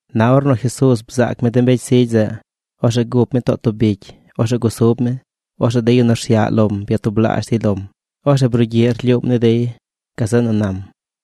Na ornu Jesuuz bzaac mi de mbecy zigy zeꞌ, orzeꞌ gup mi too tub bicy. Orzeꞌ gusub mi. Orzeꞌ de yu nu rsyaꞌ lom byatublaazh dey lom. Orzeꞌ brugyiꞌ rlyuum ni dey. Gazeꞌ nu nam: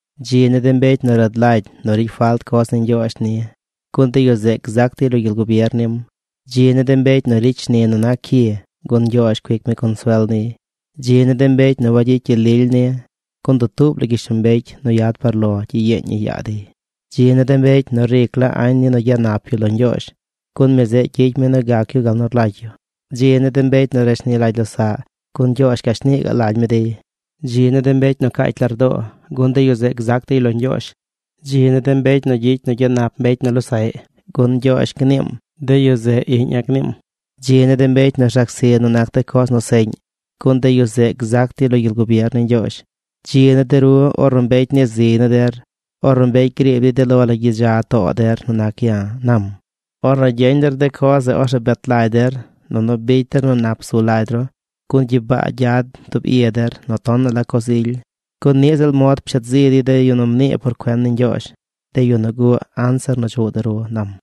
―Dzi ni de mbecy nu rad lagy nu ricy falt coz ni Ñgyoozh ni, gun de yu zeꞌ gzac dey lo gyel gubier nim. ’Dzi ni de mbecy nu ricy shni nu nac cyi gun Ñgyoozh cuic mi consuel niy. ’Dzi ni de mbecy nu wayicy gyel lily ni, gun dutuub la gyishlombecy nu yad par lo gyiyeeñ ñi yaa dey. ’Dzi ni de mbecy nu ric la añ ni nu gyanap yu lo Ñgyoozh, gun mi zeꞌ gyicy mi nu gac yu gal nu rlagy yu. ’Dzi ni de mbecy nu rashni lagy losaꞌ, gun Ñgyoozh gashnii gaꞌ lagy mi dey. ’Dzi ni de mbecy nu caacy lardoo, gun de yu zeꞌ gzac dey lo Ñgyoozh. ’Dzi ni de mbecy nu gyicy nu gyanap mbecy nu losaꞌy, gun Ñgyoozh gniim: “De yu zeꞌ iꞌña̱”, gniim. ’Dzi ni de mbecy nu rzac zi nu nac de coz nu seꞌñ, gun de yu zeꞌ gzac dey lo gyel gubier ni Ñgyoozh. ’Dzi ni de ru ornu mbecy nii ziy ni der, ornu mbecy griib dey de lo la gyidza too der nu nac ya̱ ―nam―. Ornu gyeñ der de coz zeꞌ, orzeꞌ bet lagy der, nunu bicy der nu nap zu lagy ru gun gyibaa gyad tub i der nu tonaꞌ la coz ily. Gun niꞌ ziꞌl mod pshet zi dey de yu nu mnii por cuen ni Ñgyoozh, de yu nu guꞌ anzir nu chuꞌ de ru ―nam―.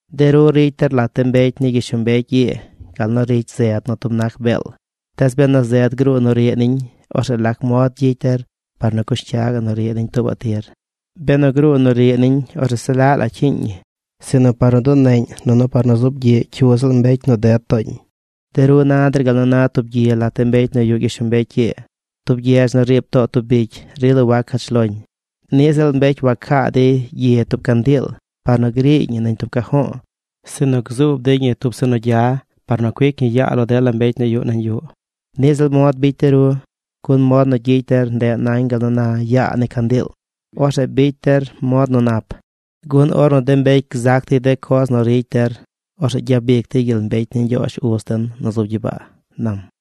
’De ru ricy der lat de mbecy ni gyishlombecy ii gal nu ricy zed nu tub nac beel. Tees benu zed gruu nu riꞌ niñ, orzeꞌ ¿lac mod gyicy der par nu cush cyaꞌ nu riꞌ niñ tuubaꞌ tir? Benu gruu nu riꞌ niñ, orzeꞌ se laꞌ la cyiiñ ñi, sinu par nu duneꞌñ nunu par nu zuub gyiꞌ cyu ziꞌl mbecy nu ded tooñ. ’De ru na der gal nu na tub gyi lat de mbecy nu yuꞌ gyishlombecy ii. Tub gyedz nu riib too tub bicy rila wac cach loñ. Niꞌ ziꞌl mbecy wacaa dey gyi tub candiil par nu griiy ñi nañ tub cajo̱o̱, sinu gzuub dey ñi tub zeꞌ nu gya par nu cuic ñi yaa lo dela mbecy nu yuꞌ nañ yuꞌ. Niꞌ ziꞌl mod bicy de ru. Gun mod nu gyicy der ndeꞌ nañ gal nu na yaa ni candiil. Orzeꞌ bicy der mod nu nap, gun ornu de mbecy gzac dey de coz nu ricy der, orzeꞌ gyabic dey gyel mbecy ni Ñgyoozh uz den nu zub gyibaa ―nam―.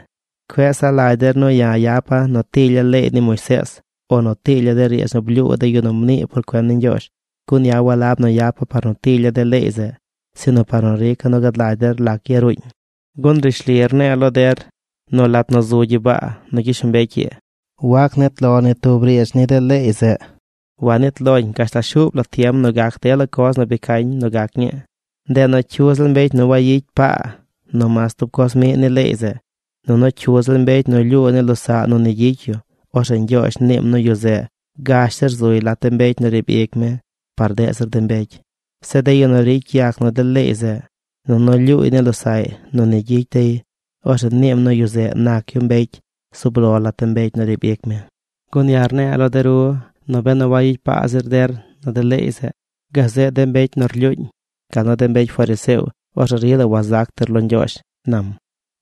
’Cueꞌ saꞌ lagy der nu ya̱ yapa̱ nu tilya̱ leey ni Moisees o nu tilya̱ de riidz nu blyuu de yu nu mnii por cuen ni Ñgyoozh. Gun ya̱ walab nu yapa̱ par nu tilya̱ de leey zeꞌ sinu par nu rica̱ nu gad lagy der lac yaruuñ. Gun rishli rne̱e̱ lo der nu lat nu zu gyibaa nu gyishlombecy ii, wac nit lo ni tub riidz ni de leey zeꞌ. Wanit loñ gashtal shuub la tiem nu gac dela coz nu bi cañ nu gac ñii. Ndeꞌ nu cyu ziꞌl mbecy nu wayicy paa nu mas tub coz miꞌ ni leey zeꞌ, nunu cyu ziꞌl mbecy nu lyuu ni losaꞌ nu ni gyicy yu, orzeꞌ Ñgyoozh niim nu yu zeꞌ gash zir zuy lat de mbecy nu riib ic mi par deꞌ zir mbecy. Zeꞌ de yu nu ricy yac nu de leey zeꞌ, nunu lyuuy ni losaꞌy nu ni gyicy dey, orzeꞌ niim nu yu zeꞌ nac yu mbecy zub lo lat de mbecy nu riib ic mi. Gun ya̱ rne̱e̱ lo de ru nu benu wayicy paa zir der nu de leey zeꞌ gazeꞌ de mbecy nu rlyuuñ, gal nu de mbecy fariseo, orzeꞌ rila wazac der lo Ñgyoozh ―nam―.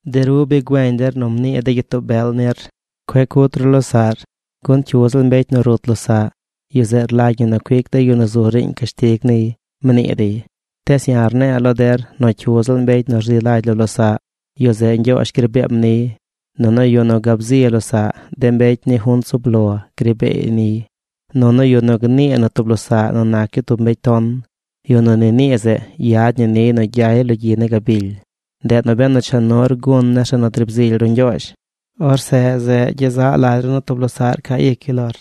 ’De ru bi güeñ der nu mnii de gyitoo bel nir: “Cueꞌ cut ru losaꞌr, gun cyu ziꞌl mbecy nu rut losaꞌ, yu zeꞌ rlagy ñi nu cuic de yu nu zu riiñ cashtig niy”, mnii dey. Tees ya̱ rne̱e̱ lo der nu cyu ziꞌl mbecy nu rzi lagy lo losaꞌ, yu zeꞌ Ñgyoozh gri beem niy. Nunu yu nu gab zi losaꞌ, de mbecy ni junt zub lo gri beey niy. Nunu yu nu gnii nu tub losaꞌ nu nac yu tub mbecy ton, yu nu ni nii zeꞌ yad ñi niy nu gyay lo gyi ni gabily. ’Ndeꞌ nu benu cha nur gun nir zeꞌ nu driib zily ru Ñgyoozh, orzeꞌ zeꞌ gyezaꞌ lagy ru nu tub losaꞌr ca ic yu lor,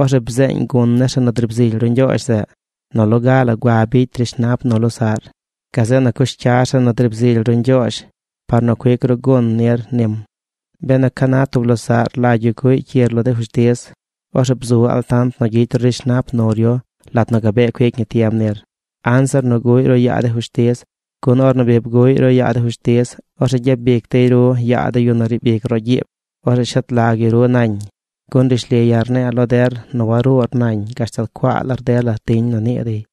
orzeꞌ bzeeñ gun nir zeꞌ nu driib zily ru Ñgyoozh zeꞌ. Nu loga la gua bicy rishnap nu losaꞌr. Gazeꞌ nu cush cyar zeꞌ nu driib zily ru Ñgyoozh par nu cuic ru gun nir nim. ’Benu ca na tub losaꞌr rlagy yu cuꞌy cyir lo de fushtiz, orzeꞌ bzu altant nu gyicy ru rishnap nur yu lat nu gabee cuic ñi tiem nir, anzir nu guꞌy ru yaa de fushtiz. Gun ornu bi bguꞌy ru yaa de fushtiz, orzeꞌ gyabic dey ru yaa de yu nu riib ic roꞌ gyiib. Orzeꞌ shet lag yu ru nañ. Gun rishli ya̱ rne̱e̱ lo der nu waruur nañ gashtal cuaa lar dela tiñ nu nii dey.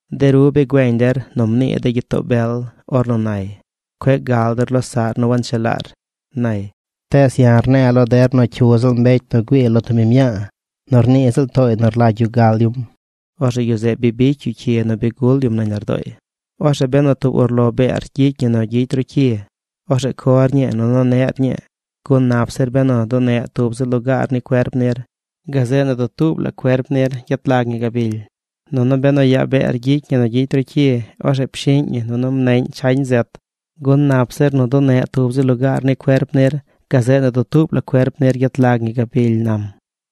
’De ru bi güeñ der nu mnii de gyitoo bel ornu nay: “Cueꞌ gal der losaꞌr nu wanchelaar”, nay. Tees ya̱ rne̱e̱ lo der nu cyu ziꞌl mbecy nu güii lo tub biñ mñaa nu rnii ziꞌl tooy nu rlagy yu gal yum, orzeꞌ yu zeꞌ bi bicy yu cyi nu bi gul yum nañ lardooy. ’Orzeꞌ benu tub urlo beer gyicy ñi nu gyicy ru cyi, orzeꞌ cor ñii nunu neꞌr ñii, gun nap zir benu duneꞌ tub zi lugaar ni cuerp nir, gazeꞌ nu dutuub la cuerp nir gyet lag ñi gabily. Nunu benu yaa beer gyicy ñi nu gyicy ru cyi, orzeꞌ pshiꞌñ ñi nunu mneꞌñ chañ zet, gun nap zir nu duneꞌ tub zi lugaar ni cuerp nir, gazeꞌ nu dutuub la cuerp nir gyet lag ñi gabily ―nam―.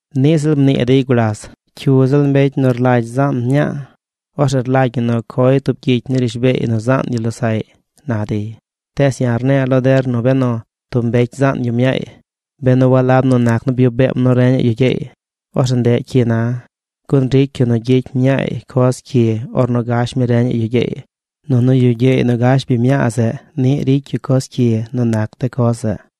’Niꞌ ziꞌl mnii dey gulas: “Cyu ziꞌl mbecy nu rlagy zaan mñaa, orzeꞌ rlagy ñi nu coy tub gyicy ni rishbeey nu zaan yu losaꞌy”, na dey. Tees ya̱ rne̱e̱ lo der nu benu tub mbecy zaan yu mñaay, benu walab nu nac nu byuꞌ beem nu reñaꞌ yu gyeey, orzeꞌ ndeꞌ cyi na, gun ricy yu nu gyicy mñaay coz cyi ornu gash mi reñaꞌ yu gyeey. Nunu yu gyeey nu gash biñ mñaa zeꞌ niꞌ ricy yu coz cyi nu nac de coz zeꞌ.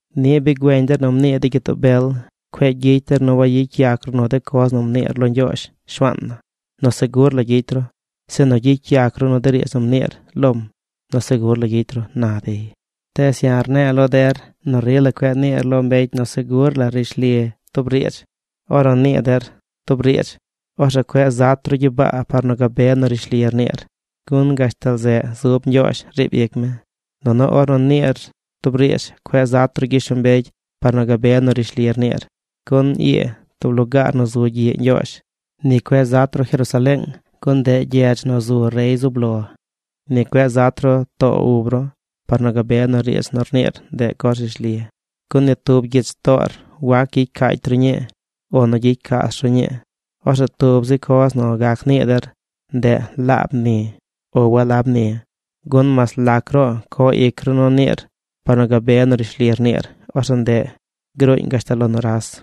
’Niꞌ bi güeñ der nu mnii de gyitoo bel: “Cueꞌ gyicy der nu wayicy yac ru nu de coz nu mniir lo Ñgyoozh, Shuaan na, nu segur la gyicy ru, sinu gyicy yac ru nu de riidz nu mniir lom nu segur la gyicy ru”, na dey. Tees ya̱ rne̱e̱ lo der nu rila cueꞌ niir lo mbecy nu segur la rishli tub riidz. Ornu nii der tub riidz, orzeꞌ cueꞌ zat ru gyibaa par nu gabe nu rishli rniir, gun gashtal zeꞌ zub Ñgyoozh riib ic mi. Nunu ornu niir tub riidz cueꞌ zat ru gyishlombecy par nu gabe nu rishli rniir, gun ii tub lugaar nu zu gyiꞌ Ñgyoozh. Ni cueꞌ zat ru Jerusaleeng, gun ndeꞌ gyedz nu zu rey zub lo. Ni cueꞌ zat ru too ub ru par nu gabe nu riidz nu rniir ndeꞌ coz rishli, gun ni tub gyich toor wac gyicy caacy ru ñii o nu gyicy caas ru ñii. Orzeꞌ tub zi coz nu gac nii der, ndeꞌ “Laab ni” o “Walab ni”, gun mas lac ruꞌ co ic ru nu niir par nu gabe nu rishli rniir, orzeꞌ ndeꞌ gruuñ gashtal lo nuras.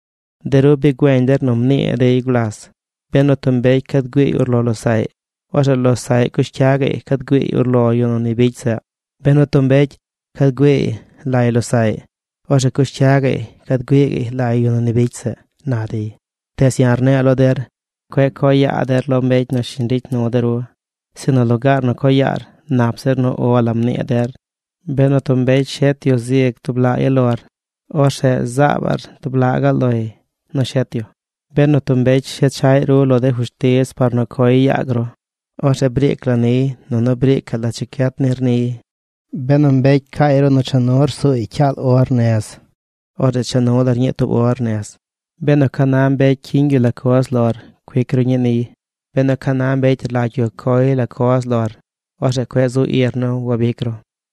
’De ru bi güeñ der nu mnii dey gulas: “Benu tub mbecy cad güiiy urlo losaꞌy, orzeꞌ losaꞌy cush cya gaꞌy cad güiiy urlo yu nu ni bicy zeꞌ. Benu tub mbecy cad güiiy lay losaꞌy, orzeꞌ cush cya gaꞌy cad güiiy lay yu nu ni bicy zeꞌ”, na dey. Tees ya̱ rne̱e̱ lo der: Cueꞌ co yaa der lo mbecy nu shiñ ricy nu de ru. Sinu lugaar nu co yaar, nap zir nu “O la” mnii der. Benu tub mbecy shet yu zig tub laꞌ yalor, orzeꞌ zaabaꞌr tub laꞌ gaꞌ loy nu shet yu. Benu tub mbecy shechaꞌy ru lo de fushtiz par nu coy yaag ru, orzeꞌ briic la niy nunu briicaꞌ la checyet nir niy. Benu mbecy caay ru nu cha nur suuy cyaal or nez, orzeꞌ cha nu lar ñii tub or nez. Benu ca na mbecy cyiñ yu la coz lor cuic ru ñii niy. Benu ca na mbecy rlagy yu coy la coz lor, orzeꞌ cueꞌ zu ir nu wabic ru.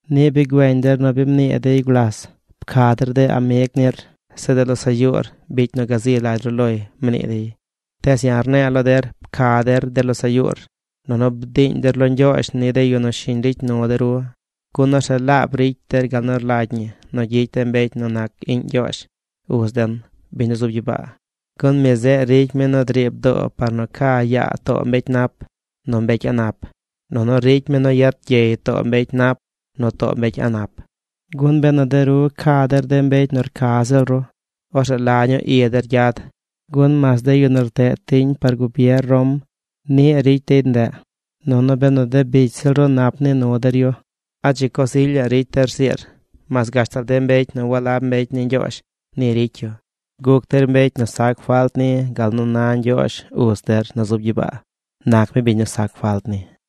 ’Niꞌ bi güeñ der nu bi mnii dey gulas: “Pca der de amig nir. Zeꞌ de losaꞌ yuur bicy nu gazi lagy ru loy”, mnii dey. Tees ya̱ rne̱e̱ lo der: Pca der de losaꞌ yuur, nunu bdiiñ der lo Ñgyoozh ni de yu nu shiñ ricy nu de ru. Gun orzeꞌ laab ricy der gal nu rlagy ñi nu gyicy de mbecy nu nac iꞌñ Ñgyoozh, uz den, biñ nu zub gyibaa. Gun mi zeꞌ ricy mi nu driib doo par nu ca yaa too mbecy nap nu mbecy a̱ꞌ nap. Nunu ricy mi nu yet gyey too mbecy nap nu too mbecy a̱ꞌ nap. Gun benu de ru ca der de mbecy nu rca ziꞌl ru, orzeꞌ ¿la ñuu i der gyad? Gun mas de yu nu rteꞌ tiñ par gubier Rom niꞌ ricy dey ndeꞌ. Nunu benu de bicy ziꞌl ru nap nii nu der yu, ¿a dzi coz ilyaꞌ ricy der rziir? Mas gashtal de mbecy nu walab mbecy ni Ñgyoozh ni ricy yu. Guc der mbecy nu sac falt ni gal nu na Ñgyoozh, Uz der nu zub gyibaa, nac mi biñ nu sac falt ni.